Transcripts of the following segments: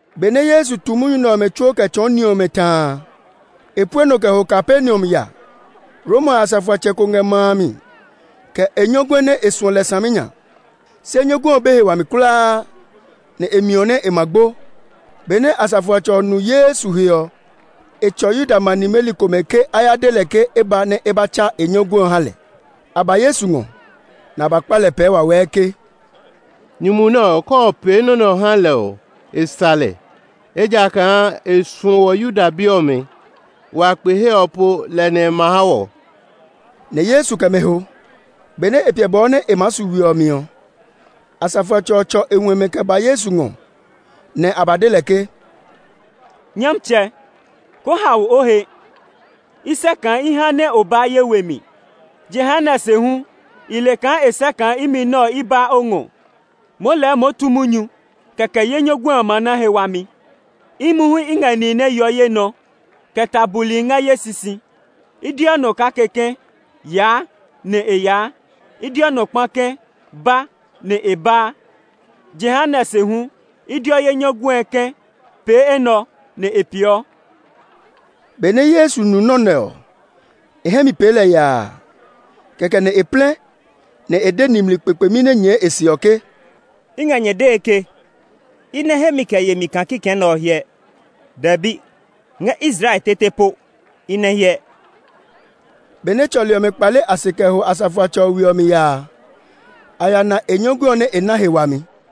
Benɛ Yesu tu munyu nɛ ɔmɛ tsuo kɛ tsɔɔ ni ɔmɛ ta a, e pue nɔ kɛ ho Kapernaum ya. Roma asafoatsɛ ko ngɛ ma a mi, kɛ e nyɔguɛ nɛ e suɔ lɛ saminya. Se nyɔguɛ ɔ be he wami kulaa, nɛ e miɔ nɛ e ma gbo. Benɛ asafoatsɛ ɔ nu Yesu he ɔ, e tsɔ Yuda ma nimeli komɛ ke a ya de lɛ ke e ba nɛ e ba tsa e nyɔguɛ ɔ ha lɛ. A ba Yesu ngɔ, nɛ a ba kpa lɛ pɛɛ wawɛɛ ke, “Nyumu nɛ ɔ, ke o pee nɔ́ nɛ ɔ ha lɛ ɔ, e sa lɛ, ejakaa e suɔ wɔ Yuda bi ɔmɛ; wa kpe he ɔ po lɛ nɛ e ma ha wɔ.” Nɛ Yesu kɛ mɛ ho. Benɛ e piɛ bɔɔ nɛ e maa su we ɔ mi ɔ, asafoatsɛ ɔ tsɔ e huɛmɛ kɛ ba Yesu ngɔ, nɛ a ba de lɛ ke, “Nyɔmtsɛ, koo hao o he. I sɛ́ kaa i haa nɛ o baa ye we mi. Jehanɛ se hu, i le kaa e sɛ́ kaa imi nɛ ɔ, i baa o ngɔ. Moo lɛɛ moo tu munyu, kɛkɛ ye nyɔguɛ ɔ ma na he wami. Imi hu i ngɛ nihi nɛ yeɔ ye nɔ, kɛ ta buli ngɛ ye sisi. I deɔ nɔ kake ke, ‘Yaa!’ nɛ e yaa; i deɔ nɔ kpa ke, ‘Ba!’ nɛ e baa; jehanɛ se hu, i deɔ ye nyɔguɛ ke, ‘Pee enɛ ɔ!’ nɛ e peeɔ.” Benɛ Yesu nu nɔ́ nɛ ɔ, e hɛ mi pee lɛ yaa. Kɛkɛ nɛ e plɛ, nɛ e de nimli kpekpemi nɛ nyɛɛ e se ɔ ke, “I ngɛ nyɛ dee ke, i nɛ hemi kɛ yemi kaa kikɛ nɛ ɔ hyɛ; dɛbi, ngɛ Israel tete po i nɛ hyɛ!” Benɛ tsɔli ɔmɛ kpale a se kɛ ho asafoatsɛ ɔ we ɔ mi ya a, a ya na e nyɔguɛ ɔ nɛ e na he wami.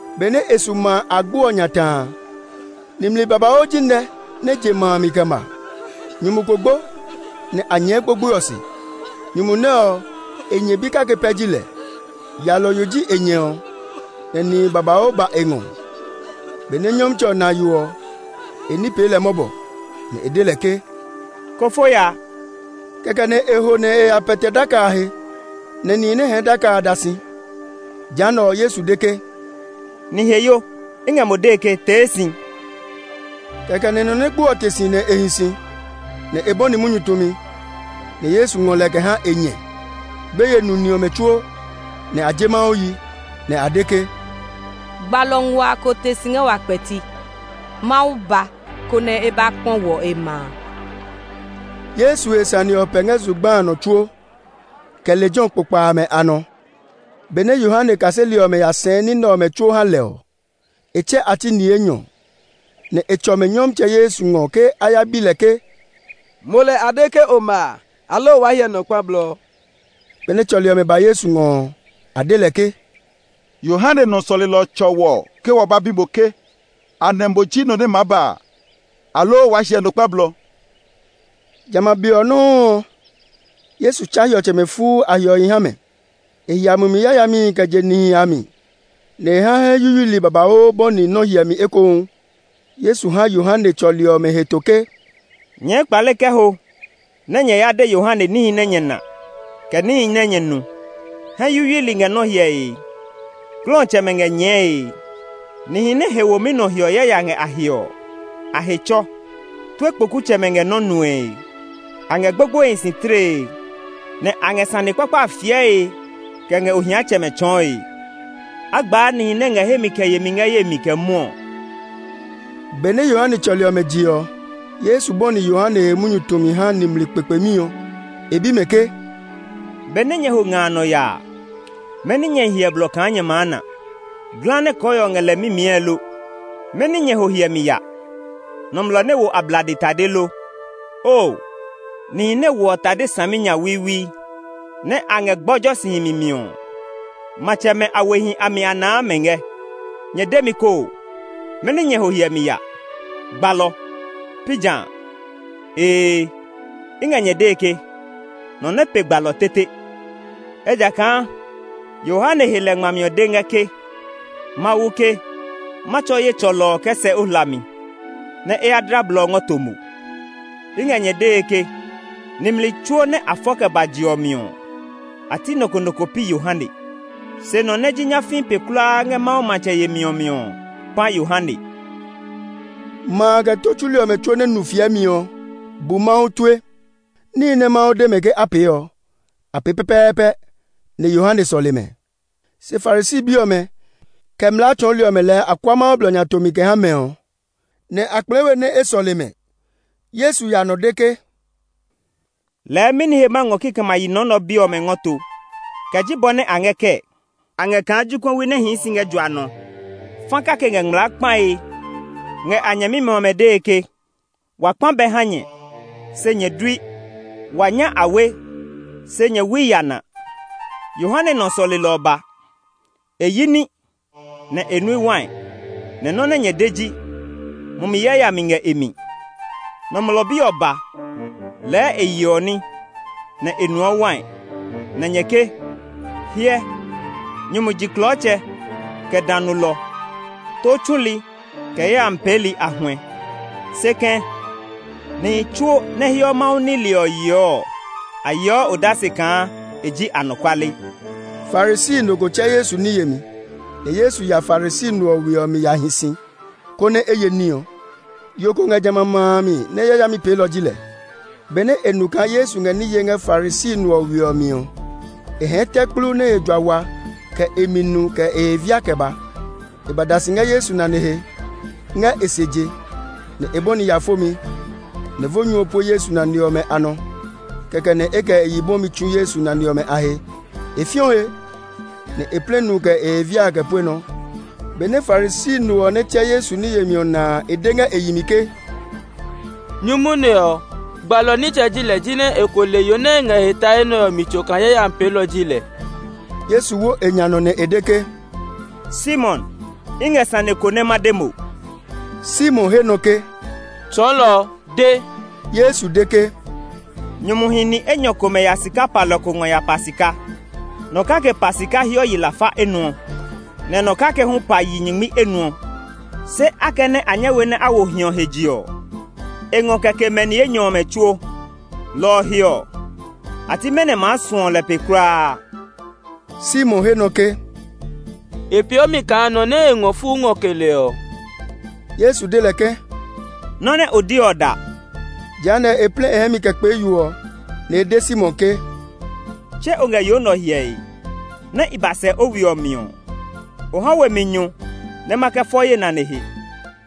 Benɛ e su ma a agbo ɔ nya ta a, nimli babauu ji nɛ nɛ je ma a mi kɛ ma. Nyumu ko gbo, nɛ a nyɛɛ gbogboe ɔ se. Nyumu nɛ ɔ, e nyɛ bi kake pɛ ji lɛ; yalɔyo ji e nyɛ ɔ, nɛ nihi babauu ba e ngɔ. Benɛ Nyɔmtsɛ ɔ na yo ɔ, e ní pee lɛ mɔbɔ, nɛ e de lɛ ke, “Ko fo ya!” Kɛkɛ nɛ e ho nɛ e ya pɛtɛ daka a he, nɛ nihi nɛ hɛɛ daka a da si. Jehanɛ ɔ, Yesu de ke, “Niheyo, i ngɛ mo dee ke, tee si!” Kɛkɛ nɛ nɔ nɛ gbo ɔ te si nɛ e hi si, nɛ e bɔni munyu tumi. Nɛ Yesu ngɔ lɛ kɛ ha e nyɛ. Gbeye nu ni ɔmɛ tsuo, nɛ a je Mawu yi, nɛ a de ke, “Gbalɔ nguaa ko te si ngɛ wa kpɛti! Mawu ba, konɛ e ba kpɔ wɔ, e ma a!” Yesu he sane nɛ ɔ pɛ ngɛ zugba a nɔ tsuo, kɛ lejɛ ɔ kpokpa amɛ a nɔ. Benɛ Yohane kaseli ɔmɛ ya sɛɛ ní nɛ ɔmɛ tsuo ha lɛ ɔ, e tsɛ a ti ni enyɔ, nɛ e tsɔ mɛ Nyɔmtsɛ Yesu ngɔ ke a ya bi lɛ ke, “Mo lɛ a de ke o ma a, aloo waa hyɛ nɔ kpa blɔ?” Benɛ tsɔli ɔmɛ ba Yesu ngɔ ɔ, a de lɛ ke, “Yohane nɔ sɔlelɔ ɔ tsɔ wɔ ke wa ba bi mo ke, ‘Anɛ mo ji nɔ nɛ maa ba a, aloo waa hyɛ nɔ kpa blɔ?’” Jamɛ a be ɔ nɔuu ɔ, Yesu tsa hiɔtsɛmɛ fuu a hiɔhi ha mɛ; e hia mumi yayamihi kɛ je nihi a mi, nɛ e ha hɛ yuyuili babauu hyɛ nɔ́ ekohu. Yesu ha Yohane tsɔli ɔmɛ heto ke, “Nyɛɛ kpale kɛ ho nɛ nyɛ ya de Yohane níhi nɛ nyɛ na, kɛ níhi nɛ nyɛ nu: hɛ yuyuili ngɛ nɔ́ hyɛe, glɔtsɛmɛ ngɛ nyɛɛe, nihi nɛ he womi nɔ hiɔ yaya ngɛ a he ɔ, a he tsɔ, tue kpokutsɛmɛ ngɛ nɔ́ nue, a ngɛ gbogboehi si tlee, nɛ a ngɛ sane kpakpa a fiɛe kɛ ngɛ ohiatsɛmɛ tsɔɔe. A gbaa nihi nɛ ngɛ hemi kɛ yemi ngɛ ye mi kɛ mwɔɔ!” Benɛ Yohane tsɔli ɔmɛ je ɔ, Yesu bɔni Yohane he munyu tumi ha nimli kpekpemi ɔ. E bi mɛ ke, “Benɛ nyɛ ho nga a nɔ ya a mɛni nyɛ hyɛ blɔ kaa nyɛ maa na? Ngɔwu nɛ kɔɔhiɔ ngɛ lɛ mimiɛe lo? Mɛni nyɛ ho hyɛmi ya? Nɔmlɔ nɛ wo ablade tade lo? Oo, nihi nɛ woɔ tade saminyawiiwi, nɛ a ngɛ gbɔjɔ si himi mi ɔ, matsɛmɛ a wehi a mi a naa mɛ ngɛ. Nyɛ de mi koo, mɛni nyɛ ho hyɛmi ya? Gbalɔ; pi ja? Ee, i ngɛ nyɛ dee ke, nɔ nɛ pe gbalɔ tete. Ejakaa Yohane he lɛ ngmami ɔ de ngɛ ke, ‘Mawu ke, ma tsɔ ye tsɔlɔ ɔ kɛ sɛ o hlami, nɛ e ya dla blɔ ɔ ngɔ to mo.’ I ngɛ nyɛ dee ke, nimli tsuo nɛ a fɔ kɛ ba je ɔ mi ɔ, a ti nɔ ko nɔ ko pi Yohane. Se nɔ nɛ ji nyafii pe kulaa ngɛ Mawu matsɛ yemi ɔ mi ɔ pã Yohane.” Ma a, kɛ tó tsuli ɔmɛ tsuo nɛ nu fiɛmi ɔ, bu Mawu tue. Níhi nɛ Mawu de mɛ ke a pee ɔ, a pee pɛpɛɛpɛ, nɛ Yohane sɔle mɛ. Se Farisi bi ɔmɛ, kɛ mlaa tsɔɔli ɔmɛ lɛɛ a kua Mawu blɔ nya tomi kɛ ha mɛ ɔ nɛ a kplɛɛ we nɛ e sɔle mɛ. Yesu ya nɔ de ke, “Lɛɛ mɛni he ma ngɔ kikɛmɛ a yi nɔ nɛ ɔ bi ɔmɛ ngɔ to? Kɛ ji bɔ nɛ a ngɛ kɛɛ? A ngɛ kaa jokuɛwi nɛ hii si ngɛ jua nɔ. Fa kake ngɛ ngmlaa kpae ngɛ a nyɛmimɛ ɔmɛ dee ke, ‘Wa kpa bɛ ha nyɛ, se nyɛ dui! Wa nya awe, se nyɛ wui yana!’ Yohane nɔ sɔlelɔ ɔ ba. E yi ní, nɛ e nui wai, nɛ nɔ́ nɛ nyɛ de ji, ‘Mumi yayami ngɛ e mi!’ Nɔmlɔ Bi ɔ ba. Lɛɛ e yeɔ ní, nɛ e nuɔ wai, nɛ nyɛ ke, ‘Hyɛ, nyumu jiklɔɔtsɛ, kɛ dã nulɔ, tó tsuli, kɛ yayami peeli a huɛ.’ Se kɛ̃, nihi tsuo nɛ heɔ Mawu nile ɔ yeɔ ɔ, a yeɔ odase kaa e ji anɔkuale.” Farisi no ko tsɛ Yesu ní yemi, nɛ Yesu ya Farisi no ɔ we ɔ mi ya hi si, konɛ a ye ní ɔ. Yo ko ngɛ jamɛ a ma a mi nɛ yayami peelɔ ji lɛ. Benɛ e nu kaa Yesu ngɛ ní yee ngɛ Farisi no ɔ we ɔ mi ɔ, e hɛɛ tɛ kplu nɛ he jua wa kɛ e mi nu kɛ e he via kɛ ba. E ba da si ngɛ Yesu nane he, ngɛ e se je, nɛ e bɔni ya fomi; nɛ vo nyu ɔ pue Yesu nane ɔmɛ a nɔ. Kɛkɛ nɛ e kɛ e yi bwɔmi tsu Yesu nane ɔmɛ a he; e fiɔ he, nɛ e plɛ nu kɛ e he via a kɛ pue nɔ. Benɛ Farisi no ɔ nɛ tsɛ Yesu ní yemi ɔ na a, e de ngɛ e yi mi ke, “Nyumu nɛ ɔ, gbalɔ nitsɛ ji lɛ jinɛ e ko le yo nɛ ngɛ e he tae nɛ ɔ mi tso kaa yayami peelɔ ji lɛ!” Yesu wo e nya nɔ nɛ e de ke, “Simon, i ngɛ sane ko nɛ ma de mo.” Simon he nɔ ke, “Tsɔɔlɔ, de.” Yesu de ke, “Nyumuhi ni enyɔ komɛ ya sika palɔ ko ngɔ ya pa sika. Nɔ kake pa sika hiɔ yi lafa enuɔ, nɛ nɔ kake hu pa yi nyingmi enuɔ. Se akɛnɛ a nyɛ we nɛ a wo hiɔ ɔ he je ɔ, e ngɔ kɛ ke mɛ ni enyɔ ɔmɛ tsuo. Lɔ ɔ he ɔ, a ti mɛnɔ maa suɔ lɛ pe kulaa?” Simon he nɔ ke, “E peeɔ mi kaa nɔ nɛ e ngɔ fuu ngɔ ke lɛ ɔ.” Yesu de lɛ ke, “Nɔ́ nɛ o de ɔ da.” Jehanɛ, e plɛ e hɛ mi kɛ kpee yo ɔ, nɛ e de Simon ke, “Tse o ngɛ yo nɛ ɔ hyɛe? Nɛ i ba sɛ o we ɔ mi ɔ, o ha we mi nyu nɛ ma kɛ fɔ ye nane he,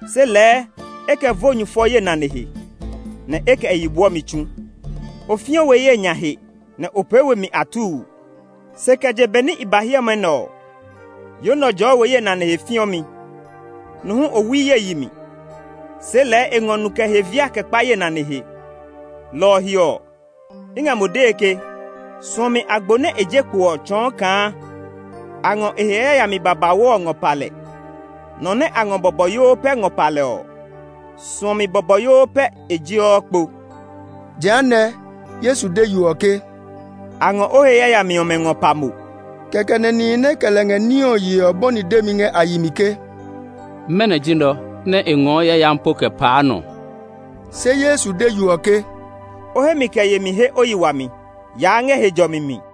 se lɛɛ e kɛ vo nyu fɔ ye nane he, nɛ e kɛ e yi bwɔmi tsu. O fiɔ we ye nya he, nɛ o pee we mi atuu. Se kɛ je be nɛ i ba hiɛmɛ nɛ ɔ, yo nɛ ɔ jɔɔ we ye nane he fiɔmi. Nu hu o wui ye yi mi, se lɛɛ e ngɔ nu kɛ e he via kɛ kpa ye nane he. Lɔ ɔ he ɔ, i ngɛ mo dee ke, suɔmi agbo nɛ e je kpo ɔ tsɔɔ kaa a ngɔ e he yayami babauu ɔ ngɔ pa lɛ. Nɔ nɛ a ngɔ bɔbɔyoo pɛ ngɔ pa lɛ ɔ, suɔmi bɔbɔyoo pɛ e jeɔ kpo.” Jehanɛ, Yesu de yo ɔ ke, “A ngɔ o he yayami ɔmɛ ngɔ pa mo.” Kɛkɛ nɛ nihi nɛ kɛ lɛ ngɛ ní ɔ yee ɔ bɔni demi ngɛ a yi mi ke, “Mɛnɔ ji nɛ ɔ, nɛ e ngɔɔ yayami po kɛ paa nɔ?” Se Yesu de yo ɔ ke, “O hemi kɛ yemi he o yi wami; yaa ngɛ he jɔmi mi.”